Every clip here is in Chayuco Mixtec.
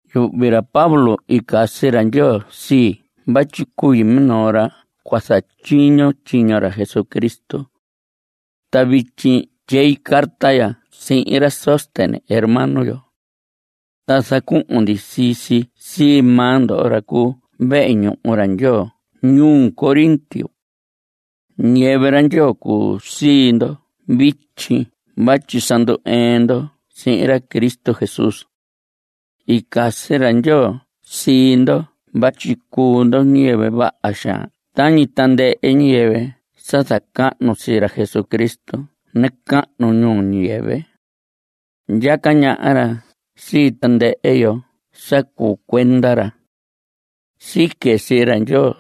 Yuhvi ra Pablo i casi ra Ndyoo sii vatyi cui minoo ra cua zatyiño tyiño ra Jesucristo. Ta vityi tyei carta ya sihin ra Sóstenes hermano yo. Ta zacuhun ndi sii si sii maa ndo ra cuu vehe ñuhu ra Ndyoo ñuu Corinto. Ñiyɨvɨ ra Ndyoo cuu sii ndo vityi vatyi sa ndu‑ɨɨn ndo sihin ra Cristo Jesús. I casi ra Ndyoo sii ndo vatyi cuu ndo ñiyɨvɨ vaha xaan tañi tandɨhɨ ñiyɨvɨ sa zacahnu sii ra Jesucristo nacahnu ñuu ñiyɨvɨ. Ndyaca ñaha ra sii tandɨhɨ yo sa cuu cuenda ra. Sique sii ra Ndyoo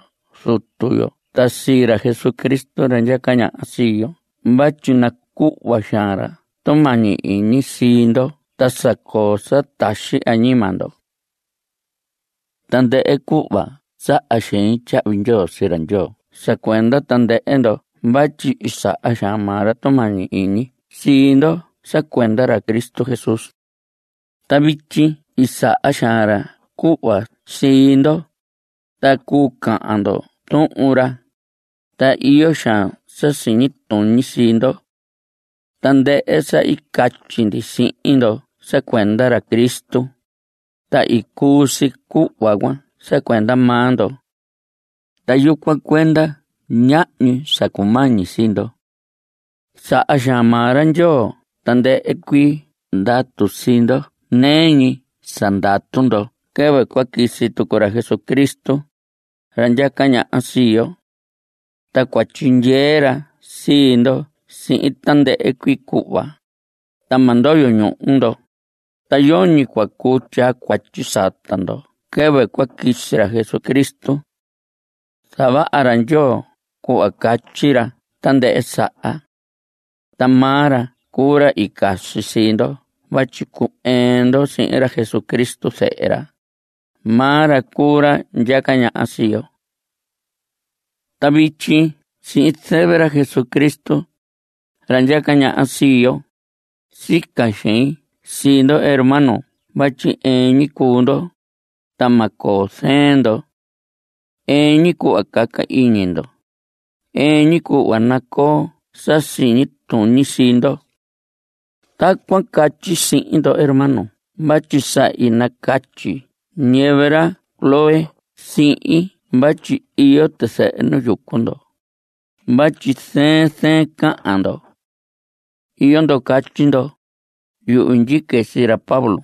Zutu yo ta sii ra Jesucristo ra ndyaca ñaha sii yo vatyi nacuhva xaan ra tumañi iñi sii ndo ta sa coo sa taxi añima ndo. Tandɨhɨ cuhva saha xein tyahvi ndyoo sii ra Ndyoo sa cuenda tandɨhɨ ndo vatyi i saha xaan maa ra tumañi iñi sii ndo sa cuenda ra Cristo Jesús. Ta vityi i saha xaan ra cuhva sii ndo, ta cuu cahan ndo Tuhun ra, ta iyo xaan sa siñi tuñi sii ndo. Tandɨhɨ sa i catyi ndi sihin ndo sa cuenda ra Cristo, ta i cuu si cuhva cuan sa cuenda maa ndo. Ta yucuan cuenda ñahñi sa cumañi sii ndo. Saha xaan maa ra Ndyoo tandɨhɨ cuii ndatu sii ndo nɨɨ ñi sa ndatu ndo quɨvɨ cua quisi tucu ra Jesucristo, ra ndyaca ñaha sii yo. Ta cua tyindyee ra sii ndo sihin tandɨhɨ cuii cuhva, ta ma ndoyo ñuhu ndo, ta yoñi cua cuu tyaa cuatyi sata ndo quɨvɨ cua quisi ra Jesucristo. Zavaha ra Ndyoo cuhva catyi ra tandɨhɨ saha. Ta maa ra cuu ra i casi sii ndo vatyi cu‑ɨɨn ndo sihin ra Jesucristo zehe ra. Maa ra cuu ra ndyaca ñaha sii yo. Ta vityi sihin zɨvɨ ra Jesucristo, ra ndyaca ñaha sii yo, sica xein sii ndo hermano vatyi ɨɨn ñi cuu ndo, ta ma coo zɨɨn ndo. Ɨɨn ñi cuhva caca iñi ndo. Ɨɨn ñi cuhva nacoo sa siñi tuñi sii ndo. Tacuan catyi sihin ndo hermano vatyi sa i nacatyi ñiyɨvɨ ra Cloé sihin vatyi iyo tizɨhɨ nu yucu ndo vatyi zɨɨn zɨɨn cahan ndo. Iyo ndo catyi ndo: “Yuhvi ndyique sii ra Pablo”,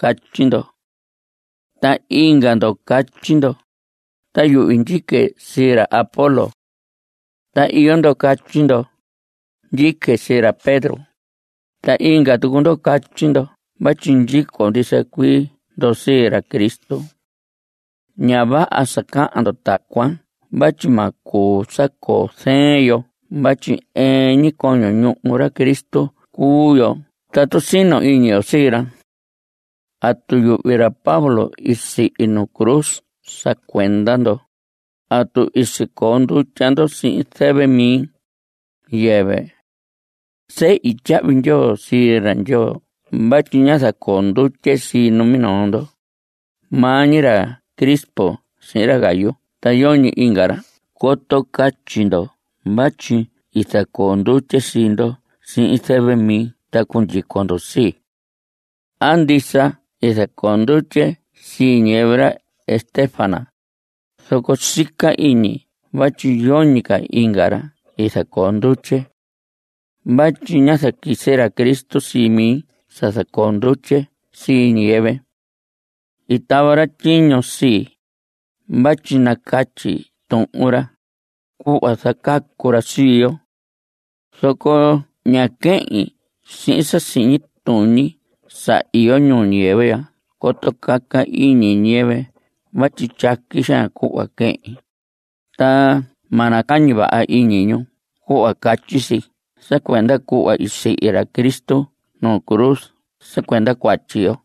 catyi ndo. Ta inga ndo catyi ndo: “Ta yuhvi ndyique sii ra Apolos.” Ta iyo ndo catyi ndo: “Ndyique sii ra Pedro.” Ta inga tucu ndo catyi ndo vatyi ndyico ndisa cuii ndo sii ra Cristo. Ña vaha sa cahan ndo tacuan vatyi ma cuu sa coo zɨɨn yo vatyi ɨɨn ñi coño ñuhu ra Cristo cuu yo tatu sino iñi yo sii ra. ¿Atu yuhvi ra Pablo i sihi nu cruz sa cuenda ndo? ¿Atu i sicoo ndutya ndo sihin zɨvɨ mi? Yɨvɨ. Sehi tyahvi ndyoo sii ra Ndyoo vatyi ñá zacoo ndutye sii numinoo ndo, maa ñi ra Crispo sihin ra Gayo ta yoñi inga ra coto catyi ndo vatyi i zacoo ndutye sii ndo sihin zɨvɨ mi ta cundyico ndo sii. Aan, ndisa i zacoo ndutye sii ñiyɨvɨ ra Estéfanas, zoco sica iñi vatyi yoñi ca inga ra i zacoo ndutye. Vatyi ñá zaquisi ra Cristo sii mi sa zacoo ndutye sii ñiyɨvɨ. I tava ra tyiño sii, vatyi nacatyi tuhun ra, cuhva zacacu ra sii yo. Zoco ña quehin sihin sa siñi tuñi sa iyo ñuu ñiyɨvɨ ya coto caca iñi ñiyɨvɨ vatyi tyaqui xaan cuhva quehin, ta ma nacañi vaha iñi ñu cuhva catyi si sa cuenda cuhva i sihi ra Cristo nu cruz sa cuenda cuatyi yo.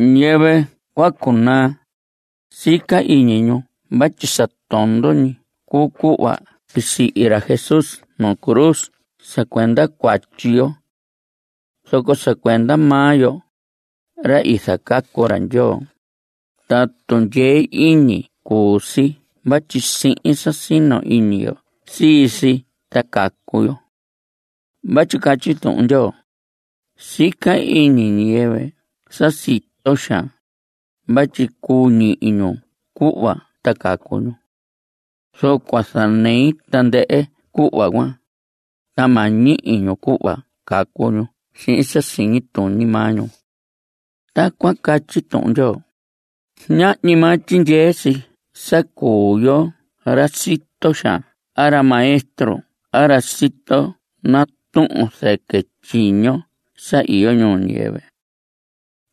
Ñiyɨvɨ cua cunaa, sica iñi ñu vatyi sa tondo ñi cuu cuhva i sihi ra Jesús nu cruz sa cuenda cuatyi yo. Zoco sa cuenda maa yo, ra i zacacu ra Ndyoo, ta tundyee iñi cuu si vatyi sihin sa sino iñi yo sii si ta cacu yo. Vatyi catyi Tuhun Ndyoo: Sica iñi ñiyɨvɨ sa sito xaan, vatyi cuu ñihi ñu cuhva ta cacu ñu. Zoco cua zanei tandɨhɨ cuhva cuan, ta ma ñihi ñu cuhva cacu ñu sihin sa siñi tuñi maa ñu. Tacuan catyi Tuhun Ndyoo. Ñahñi maa tyindyee si sa cuu yo ra sito xaan a ra maestro a ra sito natuhun zɨquɨ tyiño sa iyo ñuu ñiyɨvɨ.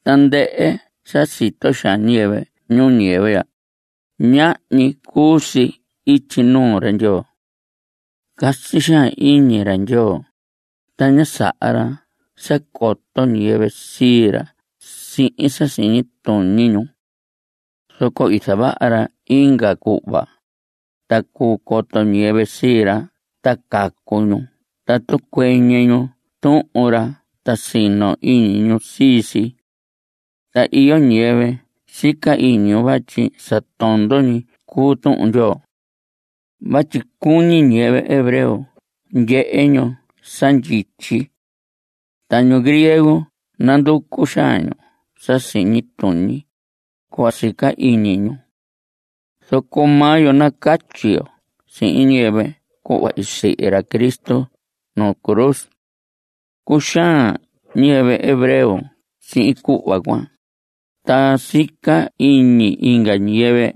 Tandɨhɨ sa sito xaan ñiyɨvɨ ñuu ñiyɨvɨ ya, ñahñi cuu si ityi nuu ra Ndyoo. Casi xaan iñi ra Ndyoo, ta ña saha ra sa coto ñiyɨvɨ sii ra sihin sa siñi tuñi ñu. Zoco i zavaha ra inga cuhva, ta cuu coto ñiyɨvɨ sii ra ta cacu ñu tatu cuɨñɨ ñu Tuhun ra ta sino iñi ñu sii si. Ta iyo ñiyɨvɨ sica iñi ñu vatyi sa tondo ñi cuu Tuhun Ndyoo. Vatyi cuñi ñiyɨvɨ hebreo ndyehe ñu sa ndyityi. Ta ñu griego nanducu xaan ñu sa siñi tuñi, cuhva sica iñi ñu. Zoco maa yo nacatyi yo sihin ñiyɨvɨ cuhva i sihi ra Cristo nuu cruz. Cuxaan ñiyɨvɨ hebreo sihin cuhva cuan, ta sica iñi inga ñiyɨvɨ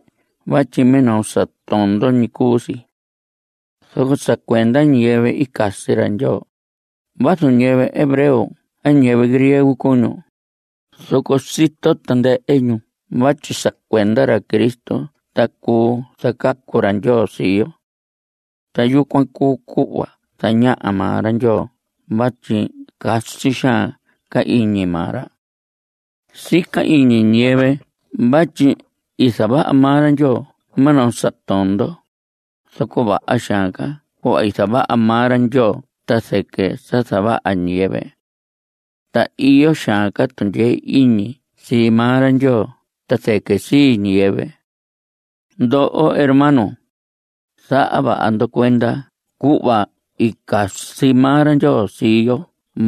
vatyi minoo sa tondo ñi cuu si. Zoco sa cuenda ñiyɨvɨ i casi ra Ndyoo, vazu ñiyɨvɨ hebreo a ñiyɨvɨ griego cuu ñu, zoco sito tandɨhɨ ñu vatyi sa cuenda ra Cristo ta cuu zacacu ra Ndyoo sii yo. Ta yucuan cuu cuhva zañaha maa ra Ndyoo vatyi casi xaan ca iñi maa ra. Sica iñi ñiyɨvɨ vatyi i zavaha maa ra Ndyoo minoo sa tondo, zoco vaha xaan ca cuhva i zavaha maa ra Ndyoo ta zɨquɨ sa zavaha ñiyɨvɨ. Ta iyo xaan ca tundyee iñi sii maa ra Ndyoo ta zɨquɨ sii ñiyɨvɨ. Ndoho hermanos, zaha vaha ndo cuenda cuhva i casi maa ra Ndyoo sii yo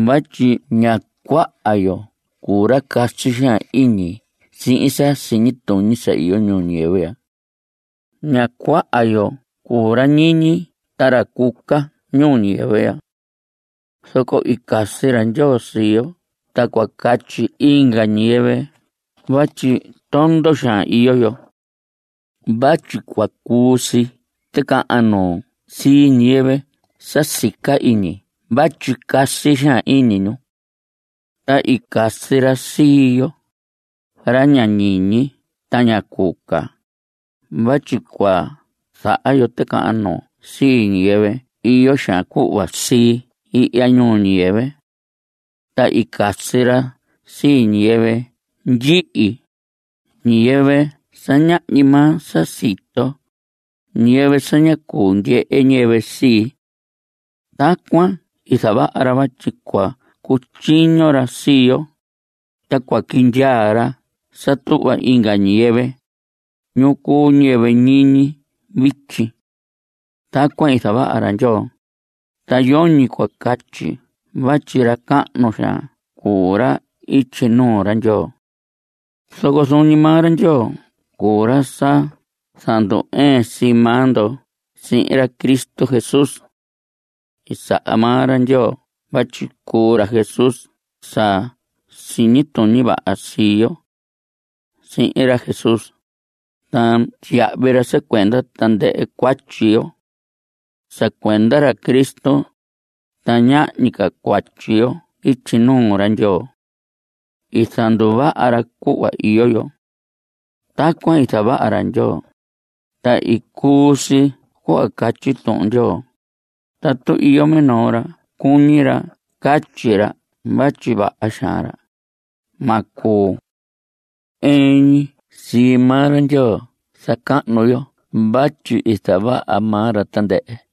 vatyi ña cuaha yo cuu ra casi xaan iñi sihin sa siñi tuñi sa iyo ñuu ñiyɨvɨ ya. Ña cuaha yo cuu ra ñiñi ta ra cuca ñuu ñiyɨvɨ ya. Zoco i casi ra Ndyoo sii yo ta cua catyi inga ñiyɨvɨ vatyi tondo xaan iyo yo. Vatyi cua cuu si ticahan nuu sii ñiyɨvɨ sa sica iñi vatyi casi xaan iñi ñu. Ta i casi ra sii yo, ra ña ñiñi ta ña cuca, vatyi cua zaha yo ticahan nuu sii ñiyɨvɨ iyo xaan cuhva sii ihya ñuu ñiyɨvɨ. Ta i casi ra sii ñiyɨvɨ ndyihi, ñiyɨvɨ sa ñahñi maa sa sito, ñiyɨvɨ sa ña cuu ndyehe ñiyɨvɨ sii. Tacuan i zavaha ra vatyi cua cutyiño ra sii yo, ta cua quindyaa ra sa tuhva inga ñiyɨvɨ, ñu cuu ñiyɨvɨ ñiñi vityi. Tacuan i zavaha ra Ndyoo, ta yoñi cua catyi vatyi ra cahnu xaan cuu ra ityi nuu ra Ndyoo. Zoco zuun ñi maa ra Ndyoo cuu ra sa zandu‑ɨɨn sii maa ndo sihin ra Cristo Jesús. I saha maa ra Ndyoo vatyi cuu ra Jesús sa siñi tuñi vaha sii yo. Sihi ra Jesús, ta tyiyahvi ra sa cuenda tandɨhɨ cuatyi yo. Sa cuenda ra Cristo, ta ñahñi ca cuatyi yo ityi nuu ra Ndyoo. I zanduvaha ra cuhva iyo yo. Tacuan i zavaha ra Ndyoo, ta i cuu si cuhva catyi Tuhun Ndyoo: “Tatu iyo minoo ra cuñi ra catyi ra vatyi vaha xaan ra, ma cuu. Ɨɨn ñi sii maa ra Ndyoo zacahnu yo vatyi i zavaha maa ra tandɨhɨ.”